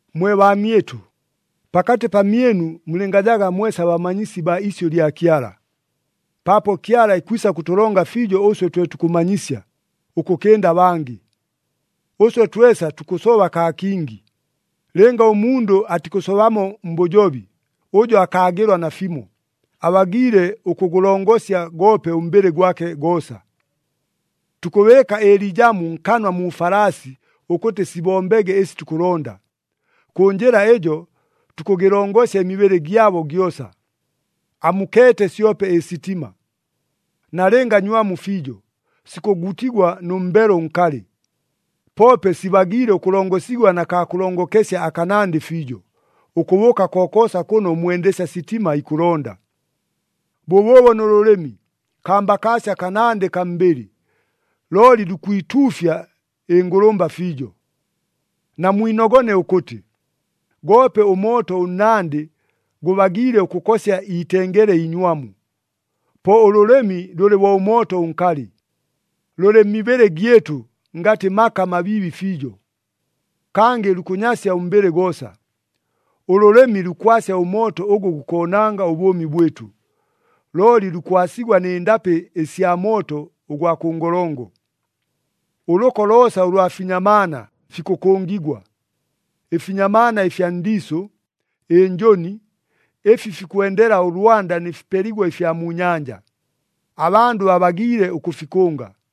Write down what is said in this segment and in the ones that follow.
Mwe baamyɨtʉ, pakatɨ pamyɨnu mulɨngajaga mwesa bamanyisi baa isyʉ lya Kyala, paapo Kyala ikwisa kʉtʉlonga fiijo ʉswe twe tukʉmanyisya, ʉkʉkɨnda abangɨ. Ʉswe twesa tukʉsoba kaa kingi. Lɨnga ʉmundʉ atikʉsobamo mbʉjobi, ʉjo akaagɨlwa nafimo, abagiile ʉkʉgʉlongosya goope ʉmbɨlɨ gwake goosa. Tukʉbɨɨka ɨliijamu nkanwa mu falaasi ʉkʉtɨ sibombege ɨsi tukʉlonda. Kʉ njɨla ɨjo tukʉgɨlongosya ɨmibɨlɨ gyabo gyosa. Amukeete syope ɨsitima. Nalɨnga nywamu fiijo, sikʉgutigwa nʉ mbelo ʉnkalɨ, poope sibagiile ʉkʉlongosigwa na kaa kʉlongokesya akanandɨ fiijo, ʉkʉbʉʉka kokoosa kʉno ʉmwendesya sitima ikʉlonda. Bʉbʉʉbo nʉ lʉlɨmi, kambakaasya kanandɨ kaa mbɨlɨ, looli lukwituufya ɨngʉlʉmba fiijo. Namwinogone ʉkʉtɨ, goope ʉmooto ʉnnandɨ gʉbagiile ʉkʉkosya iitengele iinywamu. Po ʉlʉlɨmi lʉlɨ bo ʉmooto ʉnkalɨ. Lʉlɨ mmibɨlɨ gyɨtʉ ngatɨ maka mabiibi fiijo. Kangɨ lukʉnyasya ʉmbɨlɨ goosa. Ʉlʉlɨmi lukwasya ʉmooto ʉgʉ gukoonanga ʉbʉʉmi bwɨtʉ, looli lukwasigwa nɨ ndapɨ ɨsya mooto ʉgwa kʉ ngolongo. Ʉlʉko loosa ʉlwa finyamaana fikʉkʉngigwa. Ɨfinyamaana ɨfya ndiisʉ, ɨnjʉni, ɨfi fikwendela ʉlwanda nɨ fipeligwa ɨfya mu nyanja, abandʉ babagiile ʉkʉfikʉnga.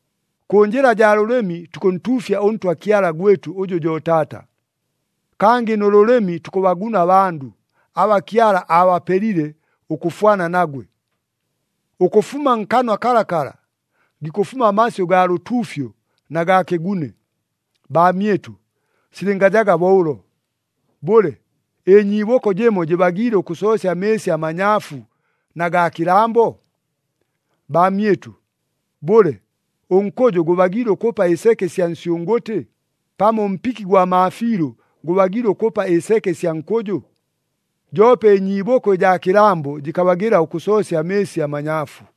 Kʉ njɨla jaa lʉlɨmi tukʉntuufya ʉNtwa Kyala gwɨtʉ ʉjʉ jo Taata. Kangɨ nʉ lʉlɨmi tukʉbaguna abandʉ, aba Kyala aabapelile ʉkʉfwana nagwe. Ʉkʉfuma nkanwa kalakala, gikʉfuma amasyʉ gaa lʉtuufyo na gaa kɨgune. Baamyɨtʉ, silɨngajaga bo ʉlo! Bʉle, ɨnyiibʉko jɨmo jɨbagiile ʉkʉsoosya amɨɨsi amanyaafu na gaa kɨlambo? Baamyɨtʉ, bʉle, ʉnkʉjʉ gʉbagiile ʉkʉpa ɨseke ɨsya nsyʉngʉtɨ, pamo ʉmpiki gwa maafiilʉ gʉbagiile ʉkʉpa ɨseke ɨsya nkʉjʉ? Joope ɨnyiibʉko ɨjaa kɨlambo jɨkabagɨla ʉkʉsoosya amɨɨsi amanyaafu.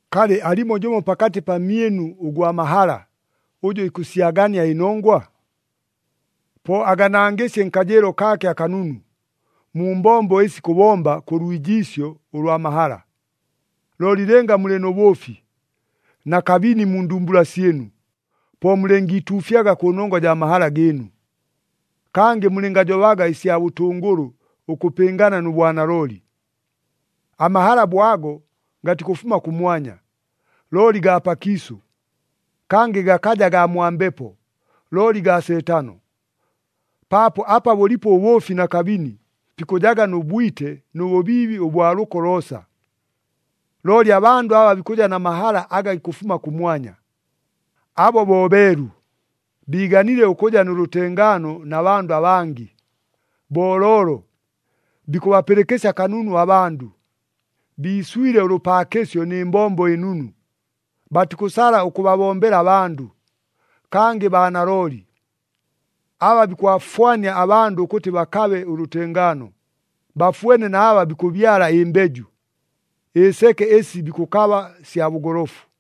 Kalɨ alimo jʉmo pakatɨ pamyɨnu ʉgwa mahala, ʉjʉ ikʉsyagania ɨnongwa? Po aganangɨsye nkajɨɨlo kaake akanunu, mu mbombo ɨsi ikʉbomba kʉ lwijiisyo ʉlwa mahala. Looli lɨnga mulɨ nʉ bʉʉfi na kabini mu ndumbula syɨnu, po mulɨngiituufyaga kʉnongwa jaa mahala gɨɨnu. Kangɨ mulɨngajobaga ɨsya bʉtʉngʉlʉ ʉkʉpɨngana nʉ bwanalooli. Amahala bo ago gatikʉfuma kʉmwanya, looli gaa pakiisʉ. Kangɨ gakaja gaa mwa Mbepo, looli gaa Seetano. Paapo apa bʉlipo ʉbʉʉfi na kabini, pikʉjaga nʉ bwite nʉ bʉbiibi ʉbwa lʉko loosa. Looli abandʉ aba bikʉja na mahala aga gikʉfuma kʉmwanya, abo bo beelu, biiganile ʉkʉja nʉ lʉtengaano na bandʉ abangɨ, booloolo, bikʉbapɨlɨkɨsya kanunu abandʉ, biiswile ʉlʉpaakɨsyo nɨ mbombo ɨnunu, batikʉsala ʉkʉbabombela abandʉ, kangɨ baa nalooli. Aba bikʉbafwania abandʉ ʉkʉtɨ bakabe ʉlʉtengaano, bafwene na aba bikʉbyala ɨmbeju. Ɨseke ɨsi bikʉkaba sya bʉgolofu.